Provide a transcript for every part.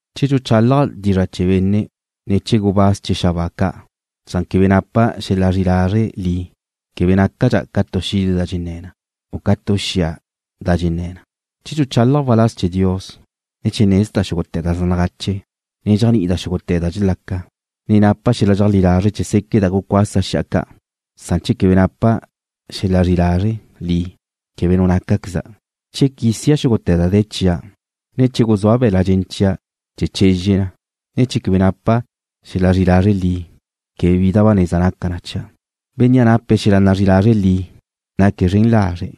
Che dxuchálaja' dizra' chee̱ benne', ne chee̱ gubáz chee̱ xabáa ca', san quebe napa' xel-la zri'i lazre' li, quebe nácadxa' ca tu xide da dxenné̱ na, u ca tu xia da dxenné̱ na. Che dxuchálaja' waláz chee̱ Dios, ne che nezda' xúgute̱ da zaj nagache, ne dxéajni'ida' xúgute̱ da dxelaca, ne napa' xel-la dxeajlí lazre' chee̱ séqueda' gucuasa' xi'a ca', san che quebe napa' xel-la zri'i lazre' li, quebe nu nácaqueza'. Che quísia' xúgute̱ da de̱ chia', ne che guzúa' be̱la' dxen chia' chee̱ chezxe na, san che quebe napa' xel-la zri'i lazre' li, quebe bi da ba neza naca na chia'. Bénnea' nape̱' xel-la zri'i lazre' li: Naque̱' zren lazre'.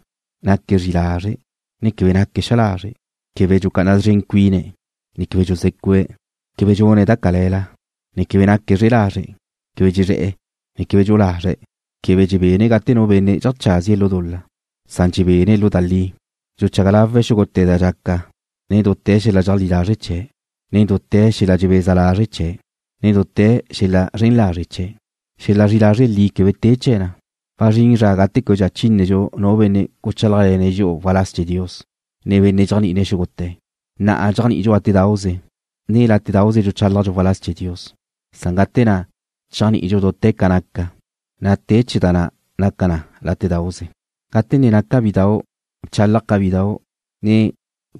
Naque̱' zri'i lazre', ne quebe naque̱' xa lazre'. Quebe dxucá'ana szren cuine̱', ne quebe dxuzé̱cu'e̱. Quebe dxune̱' da cale̱la, ne quebe naque̱' zre'e lazre'. Quebe dxezre̱'e̱, ne quebe dxu'u lazre̱'. Quebe dxebene̱' gate nu benne' dxeajcházie̱' lu dul-la, san dxebene̱' lu da li. Dxuchaga lawe̱' xúgute̱ da dxaca nen dute̱ xel-la dxeajlí lazre' chee̱', ne dute̱ xel-la dxebeza lazre' chee̱', ne dute̱ xel-la zren lazre' chee̱'. Xel-la zri'i lazre' li quebe te chee̱ na. Wazrín zra gate québedxa chínedxu nu benne' guchálajle̱ne̱' dxi'u waláz chee̱ Dios, ne benne' dxéajni'ine̱' xúgute̱. Na'a dxéajni'idxu látedauze, ne látedauze dxuchálajdxu waláz chee̱ Dios. Zrin zra gate na' chéajni'idxu dute̱ ca naca, na' te chee̱ da na' naca na látedauze. Gate ne naca' bidau' bchálaja' ca bidau', ne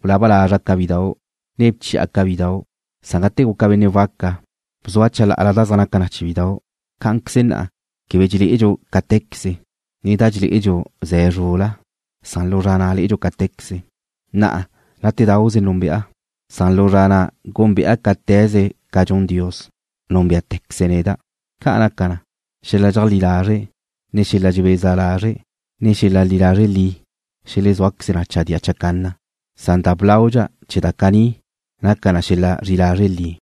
gulaba lazra' ca bidau', ne bchi'a ca bidau', san gate guca' benne' waca, bzua' chalá'ala da zaj naca chee̱ bidau'. Cá'anqueze na'a quebe dxelé'edxu cáte̱queze, ne da dxelé'edxu ze̱ zrul-la, san lu zra na' lé'edxu cáte̱queze. Na'a látedauze núnbe'a, san lu zra na' gúnbe'a cáte̱queze ca dxun Dios, núnbe'tequeze̱' neda'. Ca' naca na, xel-la dxeajlí lazre', ne xel-la dxebeza lazre', ne xel-la zri'i lazre' li xelezúaqueze na chadía chacanna, san da blaudxa chee̱ da caní naca na xel-la zri'i lazre' li.